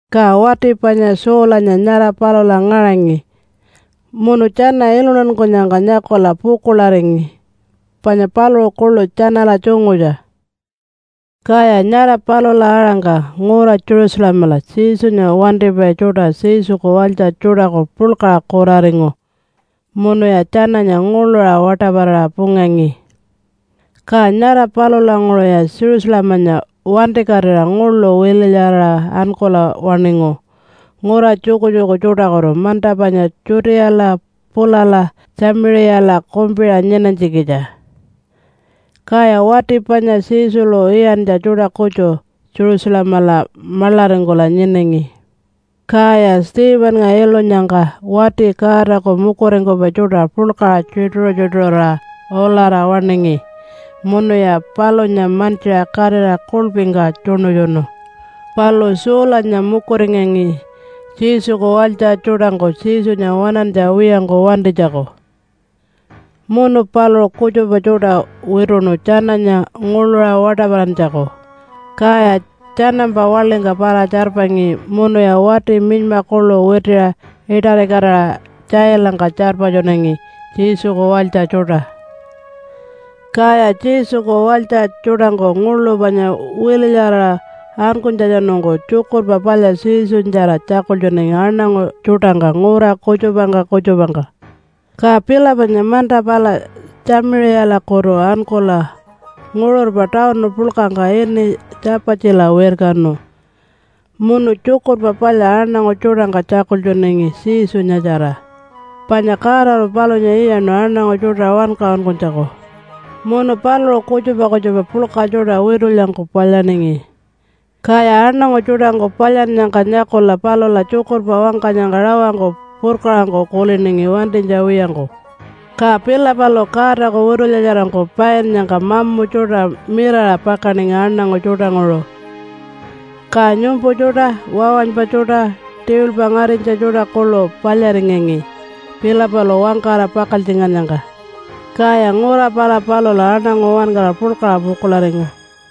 Ka wati panya Saulanya nyara palula ngaṟangi munu tjana iluntankunyangka nyakula pukuḻaringi panya paluṟu kuḻu tjanala tjungutja. Kaya nyara palula aṟangka ngura Jerusalemala Jesunya wantipai tjuṯa Jesuku walytja tjuṯaku puḻkaṟa kuraringu munuya tjananya nguḻuṟa waṯaparaṟa pungangi. Ka nyara palulanguṟuya Jerusalemanya wantikatira nguḻu wililyaraṟa ankula waṉingu ngura tjukutjuku tjuṯakutu manta panya Judeala pulala Tjamiṟiyala kumpiṟa nyinanytjikitja. Kaya wati panya Jesulu iyantja tjuṯa kutju Jerusalemala maḻaringkula nyinangi. Kaya Stephennga ilunyangka wati Godaku mukuringkupai tjuṯa puḻkaṟa tjituṟu-tjituṟurira ulara waṉingi munuya palunya mantjiṟa katira kuḻpingka tjuṉutjunu. Palu Saulanya mukuringangi Jesuku walytja tjuṯangku Jesunya waṉantja wiyangku wantinytjaku, munu paluṟu kutjupa tjuṯa wituṉu tjananya nguḻuṟa waṯaparantjaku, kaya tjanampa waḻingka para-tjarpangi munuya wati minyma kuḻu witiṟa iṯarikatira tjailangka tjarpatjunangi Jesuku walytja tjuṯa. Kaya Jesuku walytja tjuṯangku nguḻu panya wililyaraṟa ankunytjatjanungku Tjukurpa Palya Jesunyatjara tjakultjunangi aṉangu tjuṯangka ngura kutjupangka kutjupangka. Ka Philipanya manta pala Tjamiṟiyalakutu ankula nguṟurpa tawunu puḻkangka ini Tjapatjila wirkanu munu Tjukurpa Palya aṉangu tjuṯangka tjakultjunangi Jesunyatjara, panya Godalu palunya iyaṉu aṉangu tjuṯa wankaṟunkunytjaku. Munu paluṟu kutjupa kutjupa puḻka tjuṯa witulyangku palyaningi, kaya aṉangu tjuṯangku palyannyangka nyakula palula tjukurpa wangkanyangka rawangku purkaṟangku kuliningi wantinytja wiyangku. Ka Philipalu Godaku witulyatjarangku painnyangka mamu tjuṯa mirara pakaningi aṉangu tjuṯanguṟu. Ka nyumpu tjuṯa, wawanypa tjuṯa, tiwilpa ngarinytja tjuṯa kuḻu palyaringangi Philipalu wangkara pakaltjingannyangka. Kaya ngura pala palula aṉangu uwankara puḻkaṟa pukuḻaringu.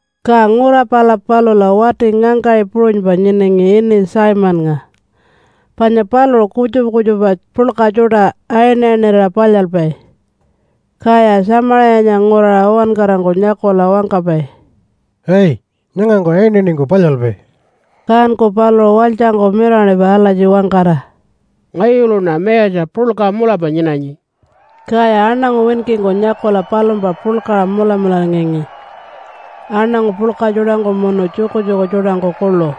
Ka ngura pala palula wati ngangkaṟi puṟunypa nyinangi ini Simonnga panya paluṟu kutjupa kutjupa puḻka tjuṯa ayinayinirira palyalpai, kaya Tjamiṟiyanya nguraṟa uwankarangku nyakula wangkapai, “Ai! Nyangangku ayinayiningku palyalpai!” Kanku paluṟu walytjangku mirawaṉipai alatji wangkara, “Ngayuluṉa mayatja puḻka mulapa nyinanyi.” Kaya aṉangu winkingku nyakula palumpa puḻkaṟa mulamularingangi, aṉangu puḻka tjuṯangku munu tjukutjuku tjuṯangku kuḻu.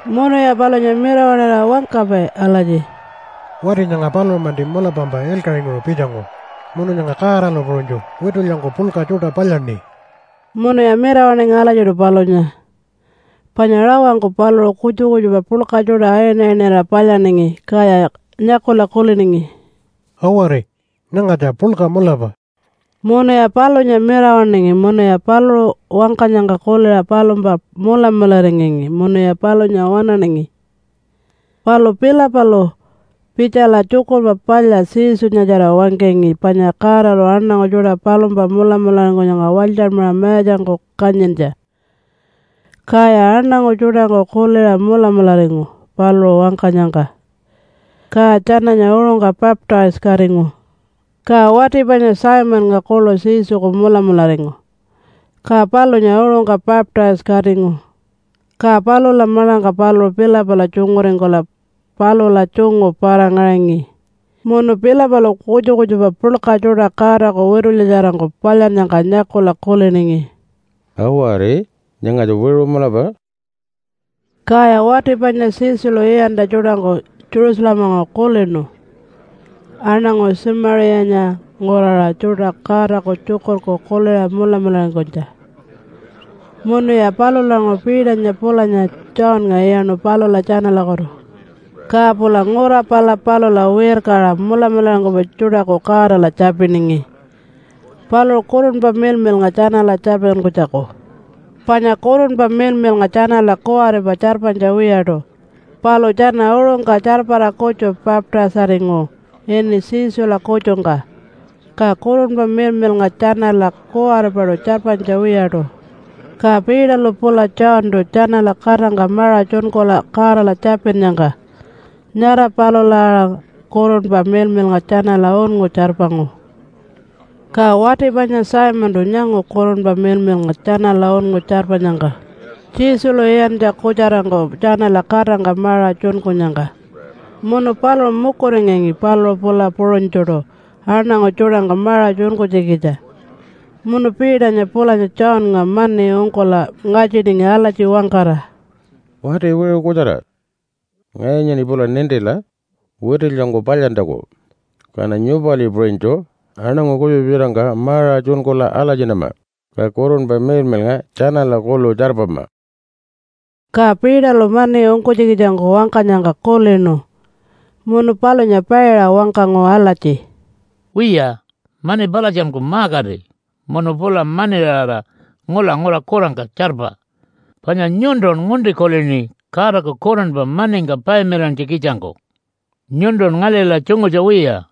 Munuya palunya mirawaṉira wangkapai alatji, “Wati nyanga paluṟu-manti mulapampa ilkaṟinguṟu pitjangu, munu nyanga Godalu puṟunytju witulyangku puḻka tjuṯa palyaṉi.” Munuya mirawaṉingi alatjiṯu palunya, panya rawangku paluṟu kutjupa kutjupa puḻka tjuṯa ayinayinirira palyaningi, kaya nyakula kuliningi, “Awari! Nyangatja puḻka mulapa.” Munuya palunya mirawaṉingi munuya paluṟu wangkanyangka kuliṟa palumpa mulamularingangi munuya palunya waṉaningi. Palu Philipalu pitjala Tjukurpa Palya Jesunyatjara wangkangi panya Godalu aṉangu tjuṯa palumpa mulamularingkunyangka walytjanmaṟa mayatjangku kanyintja. Kaya aṉangu tjuṯangku kuliṟa mulamularingu paluṟu wangkanyangka, ka tjananya uṟungka baptise-katingu. Ka wati panya Simonnga kuḻu Jesuku mulamularingu, ka palunya uṟungka baptise-katingu. Ka palula maḻangka paluṟu Philipala tjunguringkula palula tjungu para-ngaṟangi, munu Philipalu kutjupa kutjupa puḻka tjuṯa Godaku witulyatjarangku palyannyangka nyakula kuliningi, “Awari! Nyangatja wiṟu mulapa.” Kaya wati panya Jesulu iyantja tjuṯangku Jerusalemalanguṟu kulinu aṉangu Tjamiṟiyanya nguraṟa tjuṯa Godaku Tjukurku kuliṟa mulamularingkunytja munuya palulanguṟu Peternya pulanya Johnnga iyaṉu palula tjanalakutu. Ka pula ngura pala palula wirkaṟa mulamularingkupai tjuṯaku Godala tjapiningi paluṟu Kurunpa Miḻmiḻnga tjanala tjarpatjunkunytjaku. Panya Kurunpa Miḻmiḻnga tjanala kuwaripa tjarpanytja wiyaṯu, palu tjana uṟungka tjarpara kutju baptise-aringu ini Jesula kutjungka, ka Kurunpa Miḻmiḻnga tjanala kuwaripaṯu tjarpanytja wiyaṯu. Ka Peterlu pula Johntu tjanala katangka maṟa tjunkula Godala tjapinnyangka nyara palula aṟa Kurunpa Miḻmiḻnga tjanala unngu tjarpangu. Ka wati panya Simontu nyangu Kurunpa Miḻmiḻnga tjanala unngu tjarpanyangka Jesulu iyantja kutjarangku tjanala katangka maṟa tjunkunyangka. Munu paluṟu mukuringangi paluṟu pula puṟunytjuṯu aṉangu tjuṯangka maṟa tjunkunytjikitja munu Peternya pulanya Johnnga mani ungkula ngatjiningi alatji wangkara, “Wati wiṟu kutjara! Ngayunyaṉi pula nintila, witulyangku palyantjaku, kaṉa nyupali puṟunytju aṉangu kutjupa tjuṯangka maṟa tjunkula alatjinama, ka Kurunpa Miḻmiḻnga tjanala kuḻu tjarpama.” Ka Peterlu mani ungkunytjikitjangku wangkanyangka kulinu munu palunya paiṟa wangkangu alatji, “Wiya, mani palatjanku ma-kati munu pula maniṟara ngula ngura kurangka tjarpa! Panya nyuntun ngunti kulini Godaku Kurunpa maningka payamilantjikitjangku. Nyuntun ngalila tjungutja wiya,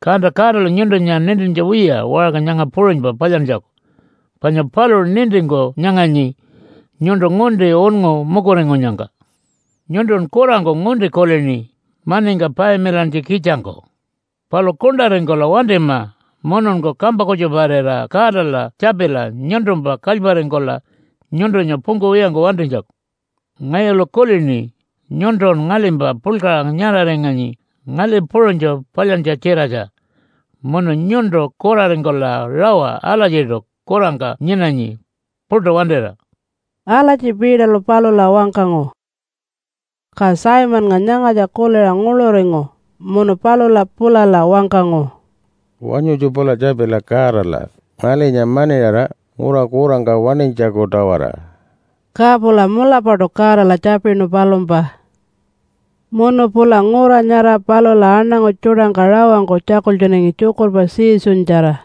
kanta Godalu nyuntunya nintintja wiya waṟka nyanga puṟunypa palyantjaku, panya paluṟu nintingku nyanganyi nyuntu ngunti unngu mukuringkunyangka. Nyuntun kurangku ngunti kulini maningka payamilantjikitjangku! Palu kuṉṯaringkula wantima mununku kampa kutjuparira Godala tjapila nyuntumpa kalyparingkula nyuntunya pungkuwiyangku wantinytjaku. Ngayulu kulini nyuntun ngalimpa puḻkaṟa nyaṟaringanyi ngali puṟunytju palyantja-tjiratja, munu nyuntu kuraringkula rawa alatjiṯu kurangka nyinanyi puṯu wantira.” Alatji Peterlu palula wangkangu. Ka Simonnga nyangatja kuliṟa nguḻuringu munu palula pulala wangkangu, “Wanyutju pula tjapila Godala ngalinya maniṟara ngura kurangka waṉinytjaku-tawara.” Ka pula mulapaṯu Godala tjapinu palumpa. Munu pula ngura nyara palula aṉangu tjuṯangka rawangku tjakultjunangi tjukurpa Jesunyatjara.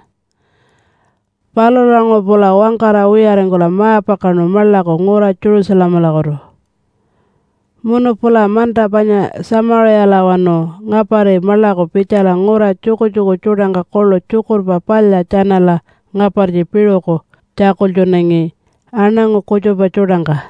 Palulanguṟu pula wangkara wiyaringkula ma-pakaṉu maḻaku ngura Jerusalemalakutu. Munu pula manta panya Tjamiṟiyalawanu ngapari maḻaku pitjala ngura tjukutjuku tjuṯangka kuḻu Tjukurpa Palya tjanala ngapartji piṟuku tjakultjunangi aṉangu kutjupa tjuṯangka.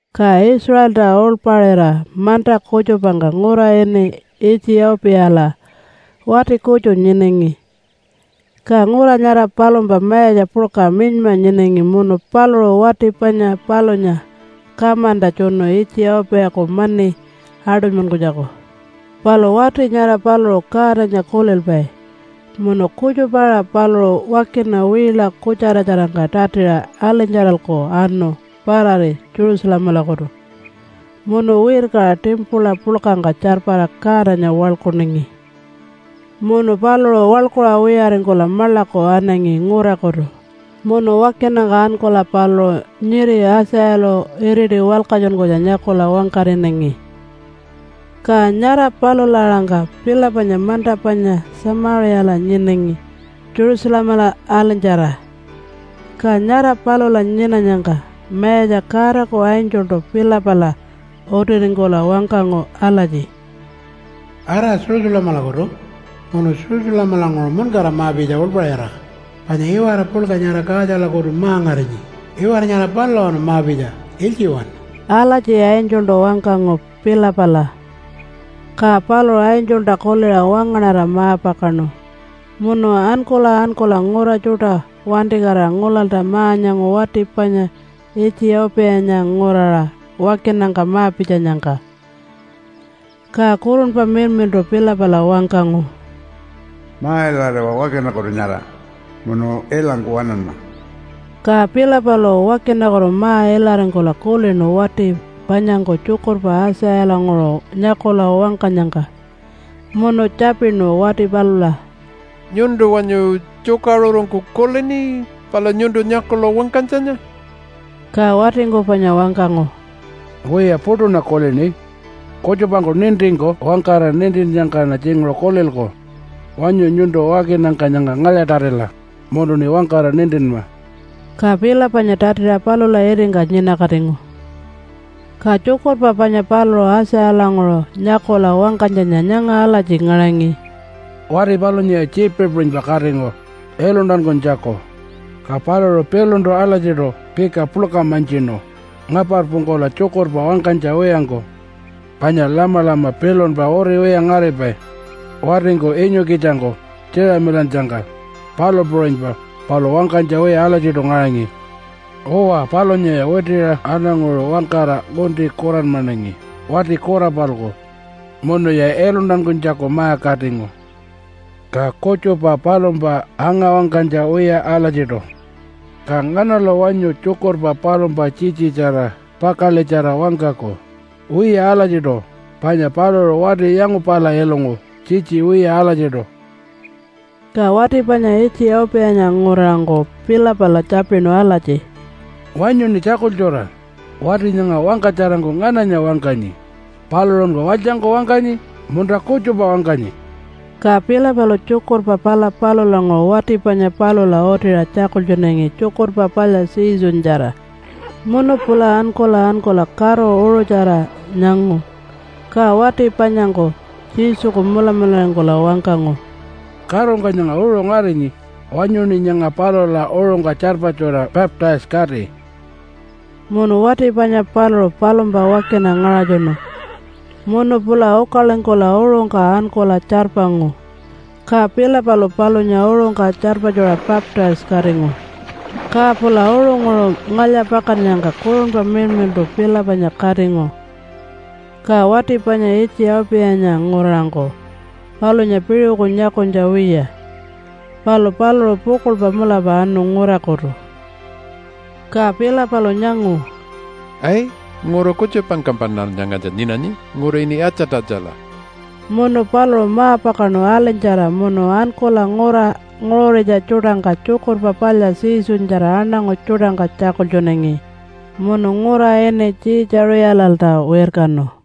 Ka Israelta uḻpaṟira manta kutjupangka ngura ini Itjiyau-piyala wati kutju nyinangi. Ka ngura nyara palumpa mayatja puḻka minyma nyinangi munu paluṟu wati panya palunya kamanta tjunu Itjiyau-piyaku mani aṯunymankunytjaku. Palu wati nyara paluṟu Godanya kulilpai munu kutjupa-aṟa paluṟu wakina wiila kutjaratjarangka tatiṟa alinytjaralku anu parari Jerusalemalakutu munu wirkaṟa timpula puḻkangka tjarpara Godanya waḻkuningi. Munu paluṟu waḻkuṟa wiyaringkula maḻaku anangi ngurakutu munu wakinangka ankula paluṟu nyiri Aitjayalu iriti walkatjunkunytja nyakula wangkaṟinangi. Ka nyara palula-aṟangka Philipanya manta panya Tjamiṟiyala nyinangi Jerusalemala alinytjara, ka nyara palula nyinanyangka Mayatja Godaku angeltu Philipala utiringkula wangkangu alatji, “Ara Jerusalemalakutu munu Jerusalemalanguṟu muṉkara ma-pitja uḻpaṟira, panya iwara puḻka nyara Kaatjalakutu ma-ngarinyi, iwara nyara palulawanu ma-pitja ilytjiwanu.” Alatji angeltu wangkangu Philipala. Ka paluṟu angelta kuliṟa wangaṉara ma-pakaṉu munu ankula ankula ngura tjuṯa wantikatira ngulalta ma-nyangu wati panya Itjiyau-piyanya nguraṟa wakinangka ma-pitjanyangka. Ka Kurunpa Miḻmiḻṯu Philipala wangkangu, “Ma-ilariwa wakinakutu nyara munu ilangku waṉanma.” Ka Philipalu wakinakutu ma-ilaringkula kulinu wati panyangku tjukurpa Aitjayalanguṟu nyakula wangkanyangka, munu tjapinu wati palula, “Nyuntu wanyu tjukaṟurungku kulini pala nyuntu nyakula wangkanytjanya?” Ka watingku panya wangkangu, “Wiya, puṯuṉa kulini. Kutjupangku nintingku wangkara nintinnyangkaṉa tjinguṟu kulilku. Wanyu nyuntu wakinangka nyanga ngalya-tatila munuṉi wangkara nintinma.” Ka Philipanya tatiṟa palula itingka nyinakatingu. Ka tjukurpa panya paluṟu Aitjayalanguṟu nyakula wangkanytjanya nyanga alatji ngaṟangi, “Wati palunyaya tjiipi puṟunypa katingu iluntankunytjaku, ka paluṟu piluntu alatjiṯu pika puḻka mantjinu ngaparpungkula tjukurpa wangkanytja wiyangku. Panya lamalama pilunpa uriwiya ngaripai watingku inyukitjangku tjiiṟamilannyangka, palu puṟunypa paluṟu wangkanytja wiya alatjiṯu ngaṟangi. Uwa, palunyaya witiṟa aṉanguṟa wangkara ngunti kuranmanangi wati kura-palku munuya iluntankunytjaku ma-katingu, ka kutjupa palumpa anga-wangkanytja wiya alatjiṯu. Ka nganalu wanyu tjukurpa palumpa tjitjitjara, pakaḻitjara wangkaku? Wiya alatjiṯu, panya paluṟu wati yangupala ilungu tjitji wiya alatjiṯu.” Ka wati panya Itjiyau-piyanya nguraṟangku Philipala tjapinu alatji, “Wanyuṉi tjakultjura wati nyanga wangkatjarangku ngananya wangkanyi? Paluṟunku walytjangku wangkanyi? Munta kutjupa wangkanyi?” Ka Philipalu tjukurpa pala palulanguṟu wati panya palula utiṟa tjakultjunangi Tjukurpa Palya Jesunyatjara. Munu pula ankula ankula karu uṟutjara nyangu, ka wati panyangku Jesuku mulamularingkula wangkangu, “Karungka nyanga uṟu ngarinyi. Wanyuṉi nyanga palula uṟungka tjarpatjuṟa baptise-kati.” Munu wati panya paluṟu palumpa wakina ngaṟatjunu. Munu pula ukalingkula uṟungka ankula tjarpangu. Ka Philipalu palunya uṟungka tjarpatjuṟa baptise-katingu. Ka pula uṟunguṟu ngalya-pakannyangka Kurunpa Miḻmiḻṯu Philipanya katingu, ka wati panya Itjiyau-piyanya nguraṟangku palunya piṟuku nyakunytja wiya, palu paluṟu pukuḻpa mulapa anu ngurakutu. Ka Philipalu nyangu, “Ai! Ngura kutjupangkampaṉal nyangatja nyinanyi ngura ini Atjatatjala.” Munu paluṟu ma-pakaṉu alinytjara munu ankula ngura nguṟuritja tjuṯangka Tjukurpa Palya Jesunyatjara aṉangu tjuṯangka tjakultjunangi munu ngura ini Tjiitjaṟiyalalta wirkanu.